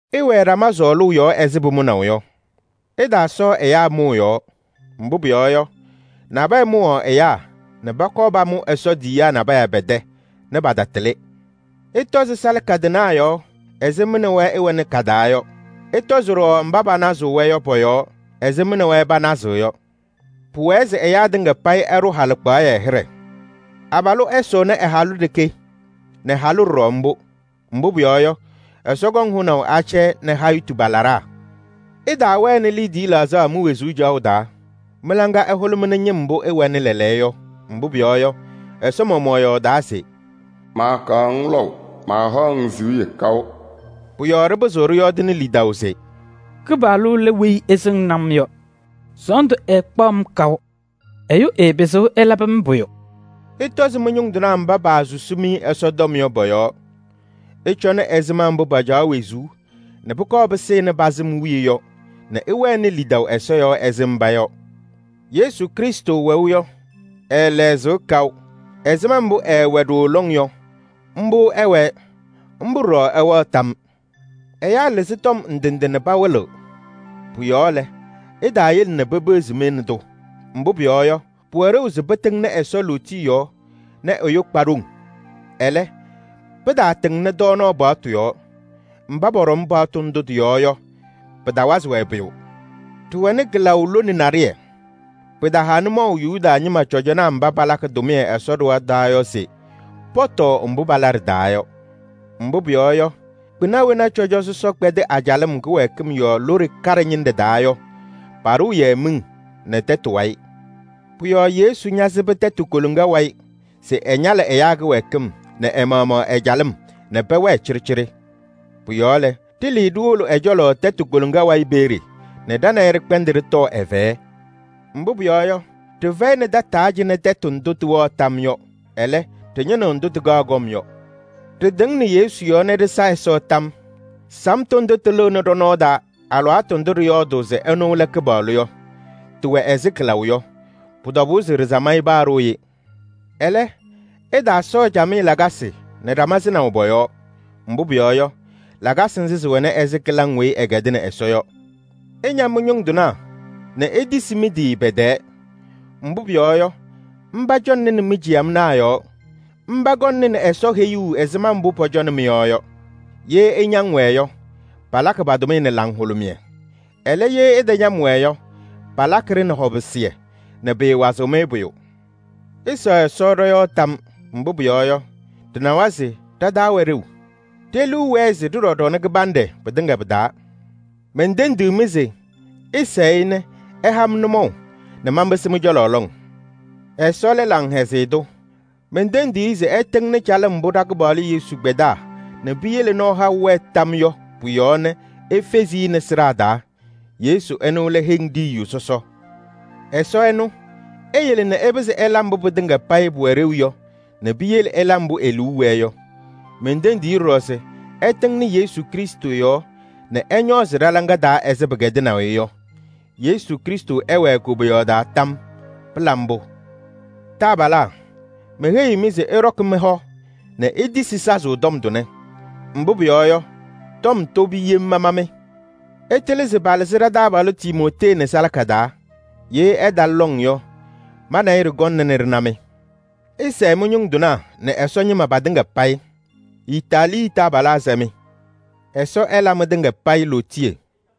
Ɩwɛɛ ɖama sɔɔlʋʋ yɔɔ ɛzɩ pʋmʋnaʋ yɔ. Ɩtaasɔɔ ɛyaa mʋʋ yɔɔ. Mbʋ pʋyɔɔ yɔ, nabɛyɛ mʋwaɣ ɛyaa nɛ pɔkɔɔ pamʋ Ɛsɔ tiyiyaa nabɛyɛ pɛ-tɛ nɛ patatɩlɩ. Ɩtɔzɩ salaka tɩnaa yɔɔ ɛzɩ mɩ nɛ wɛ ɩwɛnɩ ka-taa yɔ. Ɩtɔzɩ ɖɔɖɔ mba panazɩɣ-wɛ yɔ pɔ-yɔɔ ɛzɩ mɩ nɛ wɛ panazɩɣ yɔ. Pʋwɛɛ se ɛyaa tɩŋa payɩ ɛɖʋ halɩkpaɣyɛ hɩɖɛ. Abalʋ ɛsʋnɩ ɛ-halʋ ɖeke nɛ halʋ ɖɔɖɔ mbʋ. Mbʋ pʋyɔɔ yɔ, Ɛsɔ kɔŋ hʋnaʋ acɛyɛ nɛ hayitu pa-laɖaa. Ɩtaawɛnɩ liidiye laɣzaɣ mi-wezuu caɣʋ taa. Mɩ-laŋa ɛhʋlʋmɩnɩ ñɩm mbʋ ɩwɛnɩ lɛɛlɛɛyɔ yɔ, mbʋ pʋyɔɔ yɔ, Ɛsɔ maɣmaɣ yɔɔdaa se: “Maakaɣ-ŋ lɔʋ, maahaɣ-ŋ siɣye kaʋ.” Pʋ-yɔɔ ɖɩpɩzɩɣ ɖɩyɔɔdɩnɩ lidaʋ se: “Kɩpaɣlʋ lɛ weyi ɛsɩŋnɩ-m yɔ. Sɔɔndʋ ɛɛkpaɣ-m kaʋ. Ɛyʋ ɛɛpɩzɩɣ ɛlabɩ-m pʋyʋ!” Ɩtɔzɩ mɩ-ñʋŋ tɩnaa mba paasusi-mɩ Ɛsɔtɔm yɔ pɔ-yɔɔ. Ɩcɔnɩ ɛzɩma mbʋ pacaɣ wezuu nɛ pʋkɔɔ pɩsɩnɩ pa-sɩm wiye yɔ nɛ ɩwɛnɩ lidaʋ Ɛsɔ yɔɔ ɛzɩ mba yɔ. Yesu Krɩstʋ wɛʋ yɔ, ɛɛlɛɣzɩɣ kaʋ. Ɛzɩma mbʋ ɛɛwɛ ɖooo lɔŋ yɔ, mbʋ ɛwɛɛ, mbʋ ɖɔɖɔ ɛwɛɣ tam yɔɔ. Ɛyaa lɩzɩ tɔm ndɩ ndɩ nɛ pawɩlɩɣ. Pʋ-yɔɔ lɛ, ɩtaayele nɛ pepeɣzi-mɩ nɛ tʋ. Mbʋ pʋyɔɔ yɔ, pʋwɛ ɖeu se pɩtɩŋnɩ Ɛsɔ lootiye yɔɔ nɛ ɛyʋ kpa ɖoŋ. Ɛlɛ, pɩtaatɩŋnɩ tɔɔnaɣ paɣtʋ yɔɔ. Mba pɔɖɔm paɣtʋ ndʋ tɩ-yɔɔ yɔ, pɩtawazɩ-wɛ pʋyʋ. Ɖɩwɛnɩ kɩlaʋ lone naɖɩyɛ. Pɩtaha nʋmɔʋ Yuda ñɩma cɔjɔnaa mba palakɩ tʋmɩyɛ Ɛsɔ ɖɩɣa taa yɔ se pɔtɔɔ mbʋ pala ɖɩ-taa yɔ. Mbʋ pʋyɔɔ yɔ, kpɩna wena cɔjɔ sɔsɔ kpɛdɩ a-calɩm kɩwɛɛkɩm yɔɔ lone kaɖɛ ñɩnɖɛ taa yɔ, paɖʋʋ-yɛ miŋ nɛ tɛtʋ wayɩ. Pʋ-yɔɔ Yesu ñasɩbɩ tɛtʋ koloŋa wayɩ se ɛñalɩ ɛyaa kɩwɛɛkɩm nɛ ɛ-maɣmaɣ ɛ-calɩm nɛ pɛwɛɛ cɩɖɩcɩɖɩ. Pʋ-yɔɔ lɛ, ɖɩlɩɩ ɖiwolo ɛ-cɔlɔ tɛtʋ koloŋa wayɩ peeye nɛ ɖa nɛ ɩ ɖɩkpɛndɩ ɖɩtɔɔ ɛ-fɛyɛ. Mbʋ pʋyɔɔ yɔ, ɖɩfɛyɩnɩ tataa cɩnɛ tɛtʋ ndʋ tɩwɛɣ tam yɔ. Ɛlɛ, ɖɩñɩnɩɣ ndʋ tɩkaɣ kɔm yɔ. Ɖɩtɩŋnɩ Yesu yɔɔ nɛ ɖɩsa Ɛsɔ tam yɔɔ. Samtʋ ndʋ tɩlɩɣnɩ ɖɔ-nɔɔ taa alɩwaatʋ ndʋ ɖɩyɔɔdʋʋ se ɛnʋ lɛ Kɩpaɣlʋ yɔ, tɩwɛ ɛzɩ kɩlaʋ yɔ. Pʋ-tɔbʋʋ se ɖɩsam-ɩ paa ɖooye. Ɛlɛ, ɩtaasɔɔ camɩyɛ lakasɩ nɛ ɖama sɩnaʋ pɔ-yɔɔ. Mbʋ pʋyɔɔ yɔ, lakasɩ nzɩ sɩwɛnɩ ɛzɩ kɩlaŋ weyi ɩkɛdɩnɩ Ɛsɔ yɔ. Ɩña mɩ-ñʋŋ tɩnaa nɛ itisi mɩ-tɩ pɛ-tɛɛ. Mbʋ pʋyɔɔ yɔ, mba cɔŋnɩnɩ mi-ciyamnaa yɔɔ. Mba kɔŋnɩ Ɛsɔ heyuu ɛzɩma mbʋ pɔcɔnɩ mɩ-yɔɔ yɔ. Ye ɩñaŋ-wɛ yɔ, palakɩ pa-tʋmɩyɛ nɛ laŋhʋlʋmɩyɛ. Ɛlɛ, ye ɩtañam-wɛ yɔ, palakɩ-ɖɩ nɛ hɔpɩsɩyɛ nɛ pɩɩwazɩɣ-mɩ pʋyʋ. Ɩsɛɣ Ɛsɔ ɖɔ-yɔɔ tam. Mbʋ pʋyɔɔ yɔ, ɖɩnawa se ɖa-taa wɛ ɖeu. Ɖe-liu wɛɛ se ɖɩɖɔ ɖɔnɛ kɩbanɖɛ pɩtɩŋa pɩ-taa. Mentendiɣ-mɩ se ɩsɛɛ-ɩ nɛ ɛha-m nʋmɔʋ nɛ manpɩsɩ mɩ-cɔlɔ lɔŋ. Ɛsɔ lɛ laŋhɛzɩyɛ tʋ. Mentendiɣ-i se ɛtɩŋnɩ calɩm mbʋ ɖa-Kɩpaɣlʋ Yesu kpɛdaa nɛ piyele nɔɔ haʋ wɛɛ tam yɔɔ yɔ pʋ-yɔɔ nɛ efezi-i nɛ sɩɖaa taa. Yesu ɛnʋ lɛ heŋ ɖiyiyu sɔsɔ. Ɛsɔ ɛnʋ, eyele se ɩpɩzɩ ɩla mbʋ pɩtɩŋa payɩ pʋwɛ ɖeu yɔ nɛ piyele ɩla mbʋ e-liu wɛɛ yɔ. Mentendiɣ-i ɖɔɖɔ se ɛtɩŋnɩ Yesu Krɩstʋ yɔɔ nɛ ɛñɔɔzɩ ɖɔ-hɔ taa ɛzɩ pɩkɛdɩnaʋ-ɩ yɔ. Yesu Krɩstʋ ɛwɛɛ koboyaɣ taa tam yɔɔ! Pɩla mbʋ! Taabalaa, meheyiɣ-mɩ se ɩɖɔkɩ mɩ-hɔ nɛ itisi sazʋʋ tɔm tʋnɛ. Mbʋ pʋyɔɔ yɔ, tɔm tobi yem mama-mɩ. Ɩtɩlɩ se palɩzɩ ɖa-taabalʋ Timootee nɛ salaka taa. Ye ɛtalɩ lɔŋ yɔ, ma nɛ ɩ ɖɩkɔŋna nɛ ɖɩna-mɩ. Ɩsɛɛ mɩ-ñʋŋ tɩnaa nɛ Ɛsɔ ñɩma patɩŋa payɩ. Itaaliyɛɛ taabalaa sɛ-mɩ. Ɛsɔ ɛla mɩtɩŋa payɩ lootiye!